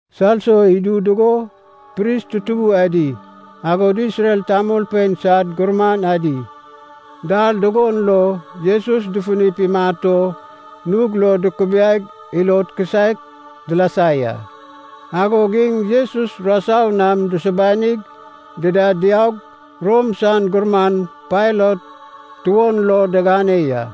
Salso idu dugo pris tutubu adi, agod Isrel tamolpein sad gurman adi, dal dugon lo Jesus dufunip imat o nug lo dukubiaig ilod kisaek dilasa ya. Agog iŋ Jesus rasau nam dusubanig dida diaug Rom san gurman Pailat tuon lo digane ya.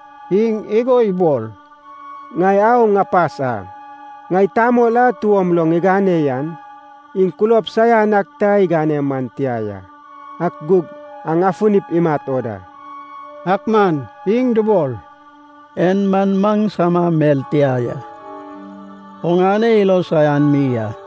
Iŋ igo ibol, “Ŋai au ŋapas a. Ŋai tamol a tuom lo ŋigane yan, iŋ kulob saian ak ta igane man tia ya, ak gug aŋ afunip imat o da.” Ak man iŋ dubol, “En man maŋsama mel tia ya, oŋane ilo saian mi a.”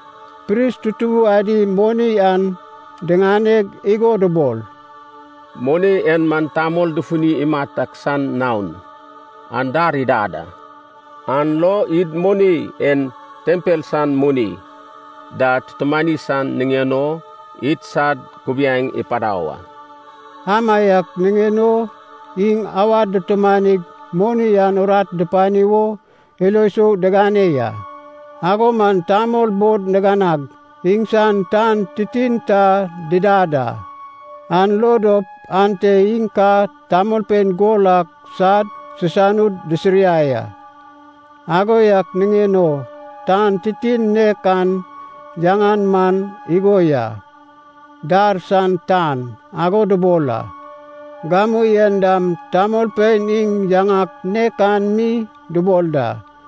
Pris tutubu adi moni an diŋaneg igo dubol, “Moni en man tamol dufuni imat ak san naon, an dar idad a. An lo id moni en tempel san moni da tutumani san niŋen o idsad kubiaeŋ ipadau a.” Amaiak niŋen o iŋ awad dutumanig moni an urat dupani wo ilo sou digane ya. Ago man tamol bod niganag, iŋsan tan titin ta didad a, an lo dop ante iŋ ka tamolpein gol ak sad sisanud disiriai a. Ago yak niŋen o, tan titin nek an yaŋan man igo ya, “Dar san tan” ago dubol a. Gamu en dam tamolpein iŋ yaŋak nek an mi dubol da.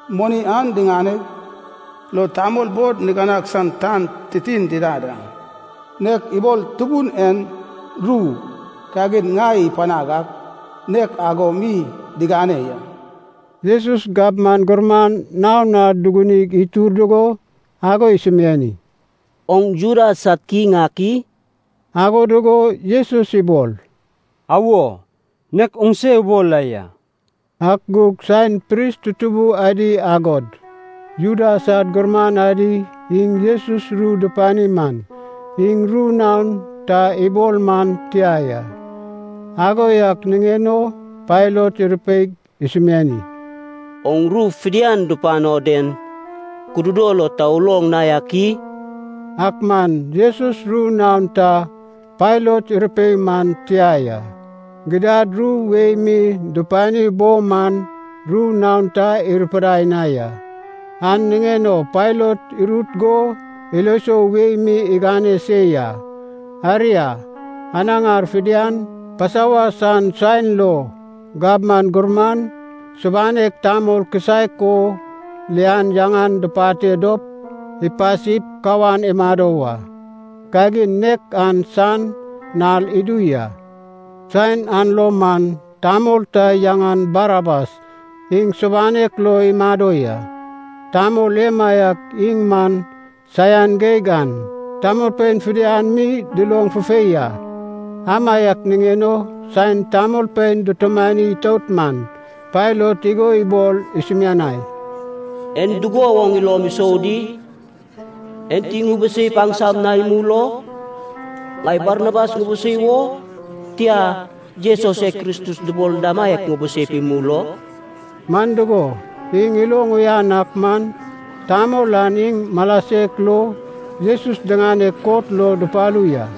Moni an diŋaneg, lo tamol bod niganag san tan titin didad a, nek ibol Tubun en ru kagin ŋai ipanag ak nek ago mi digane ya.” Jesus gabman gurman naon na dugunig itur dugo, ago isumiani, “Oŋ Juda sad kiŋ ak i?” Ago dugo Jesus ibol, “Awo, nek oŋse ubol la ya.” Ak gug saen pris tutubu adi agod Juda sad gurman adi iŋ Jesus ru dupani man, iŋ ru naon ta ibol man tia ya. Ago yak niŋen o Pailat irupeig isumiani, “Oŋ ru fidian dupano den kududo lo ta uloŋ na yak i?” Ak man Jesus ru naon ta Pailat irupei man tia ya, gidad ru wei mi dupani bo man ru naon ta irupidai na ya. An niŋen o Pailat irut go ilo sou wei mi igane se ya. Aria, anaŋar fidian, Pasova san saen lo, gabman gurman subanek tamol kisaek o lian yaŋan dupate dop, ipasip kawan imado wa. Kagin nek an san nal idu ya. Saen an lo man tamol ta yaŋan Barabas iŋ subanek lo imado ya. Tamol emaiak iŋ man saian geig an tamolpein fidian mi duloŋ fufei a. Amaiak niŋen o saen tamolpein dutumani itout man, Pailat igo ibol isumianai, “En dugo woŋ ilom isou di? Enti ŋubuseip aŋsam na imul o? Ŋai Barabas ŋubusei wo, tia, Jesus e Kristus dubol damaiak ŋubuseip imul o?” Man dugo, iŋ iloŋ uyan ak man, tamol an iŋ mala sek lo Jesus diŋaneg kot lo dupalu ya.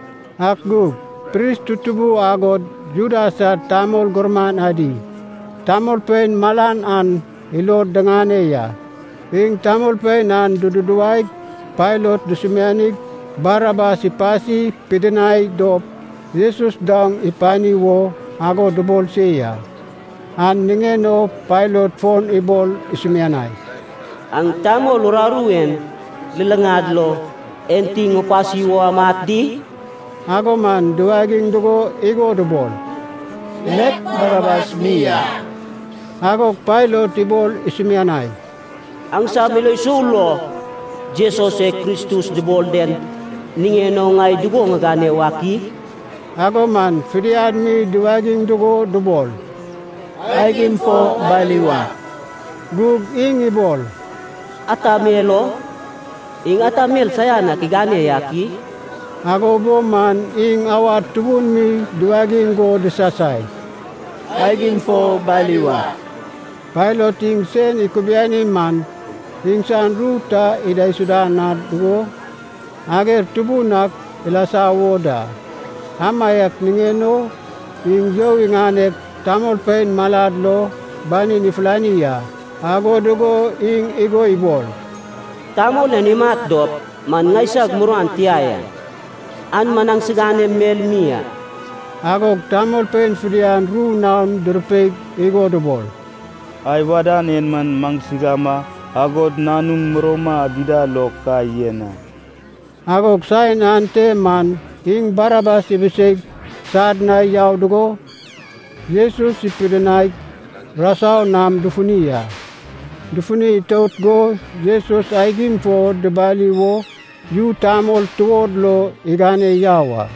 Ak gug pris tutubu agod Juda sad tamol gurman adi, tamolpein malan an ilod diŋane ya. Iŋ tamolpein an dududuwaig Pailat dusumianig Barabas ipasi pidinai dop, Jesus daoŋ ipani wo ago dubol se ya. An niŋen o Pailat fon ibol isumianai, “Aŋ tamol uraru en luluŋad lo enti ŋupasi wo amat di?” Ago man duwagiŋ dugo igo dubol, “Nek Barabas mi a.” Agog Pailat ibol isumianai, “Aŋsam ilo sou lo, Jesus e Kristus dubol den niŋen o ŋai dugo ŋigane wak i?” Ago man fidian mi duwagiŋ dugo dubol, “Aigim fo bali wa!” Gug iŋ ibol, “Ata mel o? Iŋ ata mel saian ak igane yak i?” Ago bo man iŋ awad tubun mi duwagiŋ go disasai, “Aigim fo bali wa!” Pailat iŋ sen ikubiani man, iŋsan ru ta idaisuda na dugo, ager tubun ak ilasa wo da. Amaiak niŋen o iŋ you iŋaneg, tamolpein malad lo banin ifulani a. Ago dugo iŋ igo ibol, “Tamol en imat dop man ŋaisag muruan tia ya. An man aŋsiganem mel mi a.” Agog tamolpein fidian ru naon durupeig igo dubol, “Ai wadan en man maŋsigama, agod nanum murouma dida lo, ka yen a!” Agog saen ante man iŋ Barabas ibiseig sad na yau dugo, Jesus ipidinaig rasau nam dufuni a. Dufuni itout go Jesus aigim fo dibali wo yu tamol tuod lo igane yau a.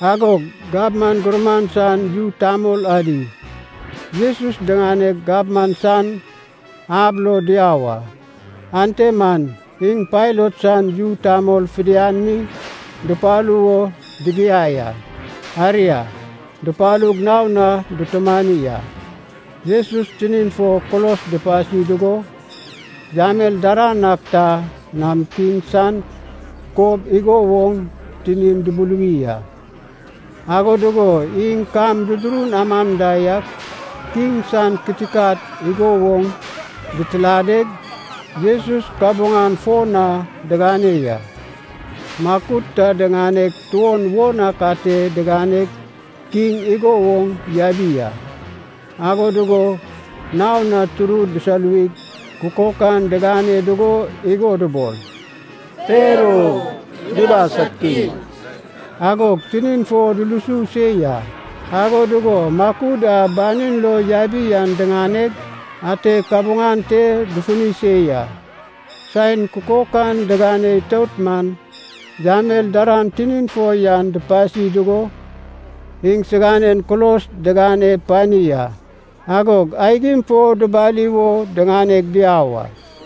Agog gabman gurman san yu tamol adi, Jesus diŋaneg gabman san ab lo diau a. Ante man iŋ Pailat san yu tamol fidian mi dupalu wo digiai a. Aria, dupalug naon na dutumani a. Jesus tinin fo kulos dupasi dugo, yamel daran ak ta nam kiŋ san kob igo woŋ tinin dubuluwi a. Ago dugo iŋ kam dudurun aman da yak, kiŋ san kitikat igo woŋ ditiladeg, Jesus kabuŋan fo na digane ya. Makud ta diŋaneg tuon won ak ate diganeg kiŋ igo woŋ yabi a. Ago dugo naon na turud disoluwig, kukok an digane dugo igo dubol, “Per o, Juda sad Kiŋ!” Agog tinin fo dulusu se ya, ago dugo makud a banin lo yabi an diŋaneg ate kabuŋan te dufuni se ya. Saen kukok an digane itout man, yamel daran tinin fo yan dupasi dugo, iŋsiganen kulos digane pani a. Agog aigim fo dubali wo diŋaneg diau a.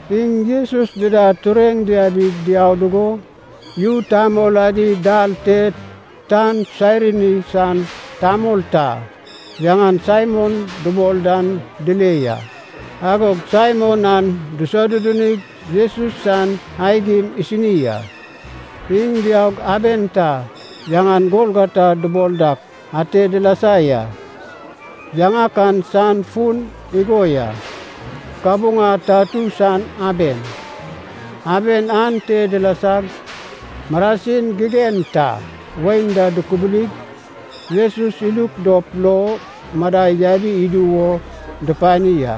Iŋ Jesus dida tureŋ diabig diau dugo, yu tamol adi dal te tan Sairini san tamol ta, yaŋan Saimon dubol dan dile ya. Agog Saimon an disodudunig Jesus san aigim isini a. Iŋ diaug aben ta, yaŋan Golgota dubol dak, ate dilasa ya. Yaŋak an san fun igo ya, “Kabuŋa tatu san aben.” Aben ante dilasag, marasin gigen ta wain da dukubulig, Jesus iluk dop lo madai yabi idu wo dupani a,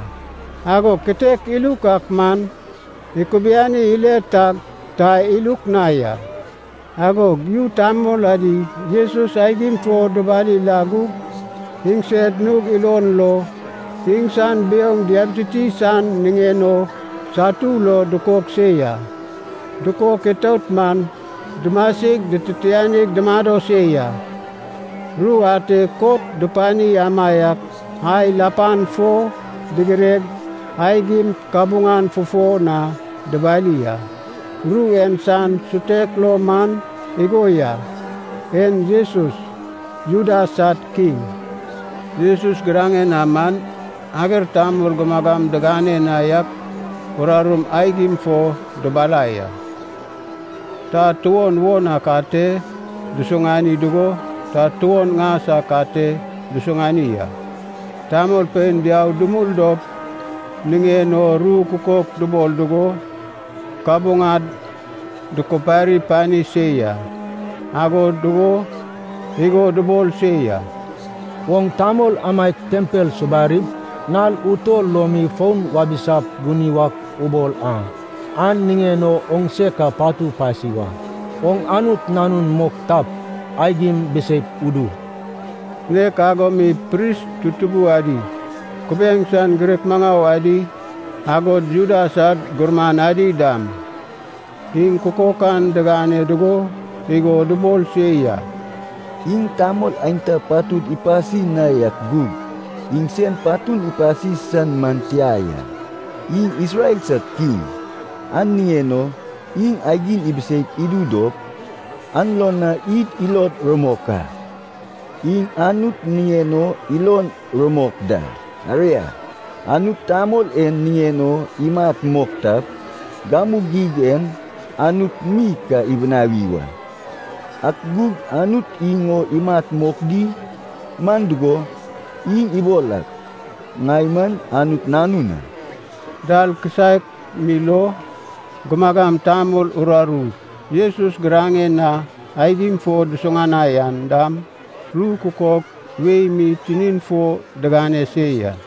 agog kitek iluk ak man ikubiani ile tag, ta iluk na ya. Agog yu tamol adi Jesus aigim fo dubali la gug, iŋsed nug ilon lo iŋsan biouŋ diabititi san niŋen o satu lo dukok se ya. Dukok itout man, dumasig dititianig dumado se ya. Ru ate kot dupani amaiak ai lapan fo digireg, aigim kabuŋan fufo na dubali a. Ru en san sutek lo man igo ya, “En Jesus, Juda sad Kiŋ.” Jesus giraŋen na man ager tamol gumagam digane na yak urarum aigim fo dubalai a. Ta tuon won ak ate dusuŋani dugo, ta tuon ŋas ak ate dusuŋani a. Tamolpein diau dumul dop niŋen o ru kukok dubol dugo, kabuŋad dukupari pani se ya. Ago dugo igo dubol se ya, “Oŋ tamol amaiak tempel subarip, nal utol lo mi foun wabisap guni wak ubol a, an niŋen o oŋ se ka patu pasi wa! Oŋ Anut Nanun mok tap, aigim biseip udu.” Nek ago mi pris tutubun adi, kubiaeŋ san girek maŋau adi, agod Juda sad gurman adi dam, iŋ kukok an digane dugo igo dubol se ya, “Iŋ tamol aenta patud ipasi na yak gug, iŋsen patun ipasi san man tia ya. Iŋ Isrel sad Kiŋ, an niŋen o iŋ aigim ibiseip idu dop, an lo na id ilod rumok a. Iŋ Anut niŋen o ilon rumok da, aria, Anut tamol en niŋen o imat mok tap, gamu geig en Anut mi ka ibinawi wa. Ak gug Anut iŋ o imat mok di? Man dugo, iŋ ibol ak, ‘Ŋai man Anut Nanun a.’” Dal kisaek mi lo gumagam tamol uraru Jesus giraŋen na aigim fo dusuŋanai an dam ru kukok wei mi tinin fo digane se ya.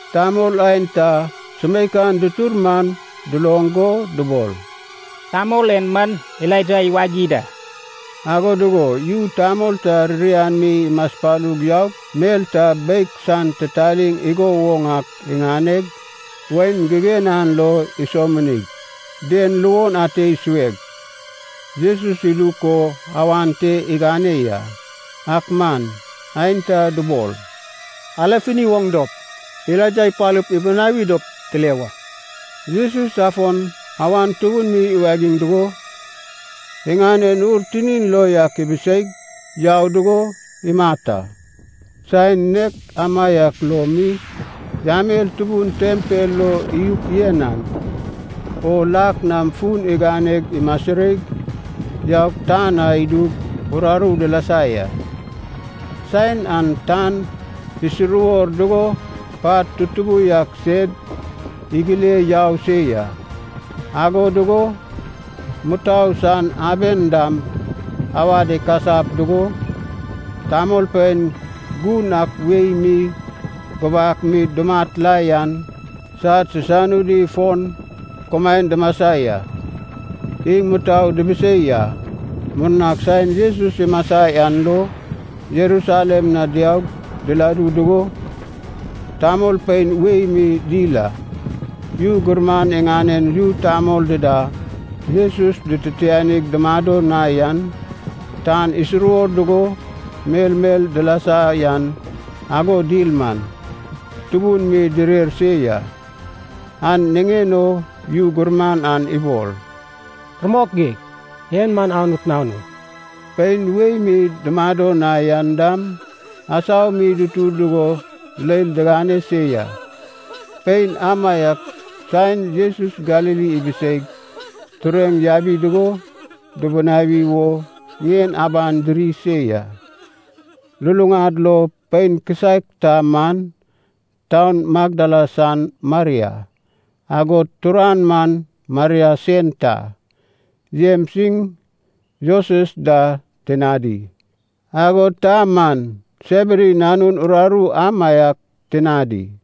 Tamol aenta sumeikan dutur man duloŋ go dubol, “Tamol en man Elaija iwagi da.” Ago dugo yu tamol ta ririan mi imaspalug yaug, mel ta beig san titaliŋ igo woŋ ak iŋaneg, wain gigen an lo isominig, den luon ate isueg, Jesus iluk o awan te igane ya. Ak man aenta dubol, “Ale funi woŋ dop, Elaija ipalup ibinawi dop tile wa.” Jesus afon awan tubun mi iwagiŋ dugo, iŋanen ur tinin lo yak ibiseig yau dugo imat a. Saen nek amaiak lo mi, yamel tubun tempel lo iyuk yen an, o lak na fun iganeg imasireig yaug tan na idug uraru dilasa ya. Saen an tan isuruwor dugo pat tutubu yak sed igile yau se ya. Ago dugo mutou san aben dam awad ikasap dugo, tamolpein gun ak wei mi gubak mi dumat la yan sad sisanudi fon kumaen dumasa ya. Iŋ mutou dubusei a. Murnag saen Jesus imasa yan lo Jerusalem na diaug diladu dugo tamolpein wei mi dil a. Yu gurman iŋanen yu tamol dida Jesus dititianig dumado na yan, tan isuruwor dugo melmel dilasa yan ago dil man, tubun mi direr se ya. An niŋen o yu gurman an ibol, “Rumok geig, en man Anut Nanun.” Pein wei mi dumado na yan dam, asau mi dutur dugo leil digane se ya. Pein amaiak saen Jesus Galili ibiseig tureŋ yabi dugo dubunawi wo ŋien aban diri se ya. Lulaŋad lo pein kisaek ta man taun Magdala san Maria, agod turan man Maria sen ta, Jems iŋ Joses da tinadi, agod ta man Sebedi nanun uraru amaiak tinadi.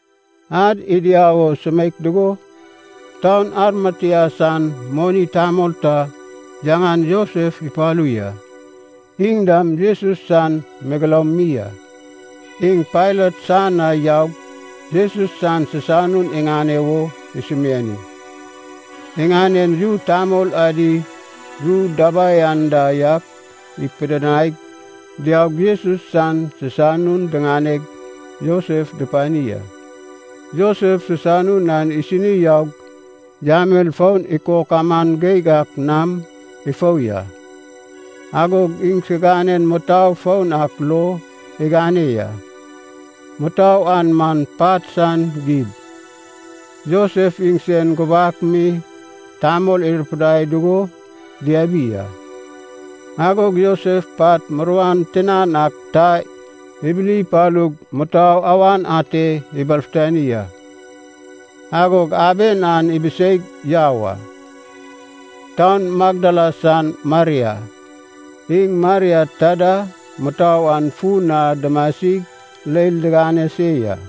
Ad idiau o sumeik dugo, taun Arimatea san moni tamol ta yaŋan Josef ipalu ya. Iŋ dam Jesus san megeloum mi a. Iŋ Pailat san na yaug Jesus san sisanun iŋane wo isumiani. Iŋanen yu tamol adi ru dabai anda yak ipidinaig diaug Jesus san sisanun diŋaneg Josef dupani a. Josef sisanun an isini yaug, yamel foun ikok aman geig ak nam ifou ya. Agog iŋsinanen mutou foun ak lo igane ya. Mutou an man pat san gib, Josef iŋsen gubak mi tamol irupidai dugo diabi a. Agog Josef pat muruan tinan ak ta ibili ipalug mutou awan ate ibalfutani a. Agog aben an ibiseig yau a. Taun Magdala san Maria, iŋ Maria ta da mutou an fun na dumasig leil digane se ya.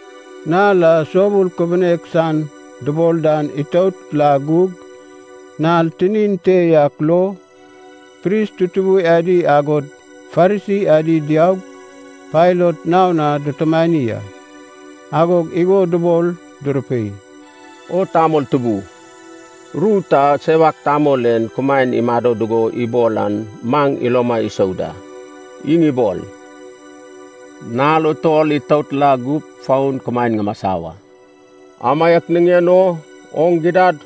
Nal a Soubul Kubunek San dubol dan itout la gug, nal tinin te yak lo, pris tutubu adi agod Farisi adi diaug Pailat naon na dutumani a. Agog igo dubol durupei, “O tamol tubu, ru ta sewak tamol en kumaen imado dugo ibol an maŋ iloma isou da. Iŋ ibol, ‘Nal utol itout la gup, fon kumaen ŋumasa wa.’ Amaiak niŋen o, oŋ gidad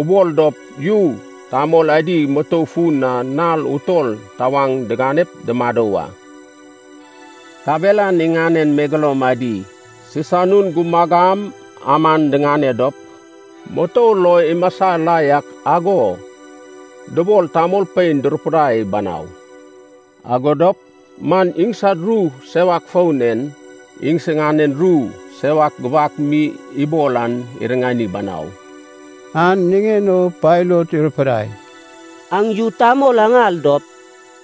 ubol dop yu tamol adi mutou fun na nal utol tawaŋ diganep dumado wa. Kabelan iŋanen megeloum adi sisanun gumagam aman diŋane dop, mutou lo imasa la yak ago dubol tamolpein durupidai banau. Ago dop man iŋsad ru sewak foun en, iŋsiganen ru sewak gubak mi ibol an iriŋani banau.” An niŋen o Pailat irupidai, “Aŋ yu tamol aŋal dop,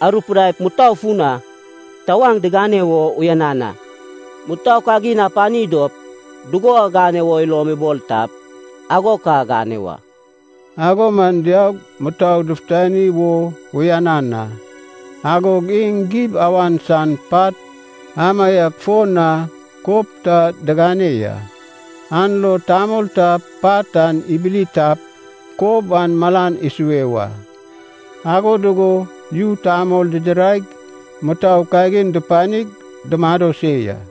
arupidaip mutou fun na tawaŋ digane wo uyanan a. Mutou kagin apani dop dugo agane wo ilom ibol tap ago ka agane wa.” Ago man diaug mutou dufutani wo uyanan a. Agog iŋ gib awan san pat amaiak fo na kob ta digane ya. An lo tamol ta pat an ibili tap kob an malan isue wa. Ago dugo yu tamol didiraig mutou kagin dupanig dumado se ya.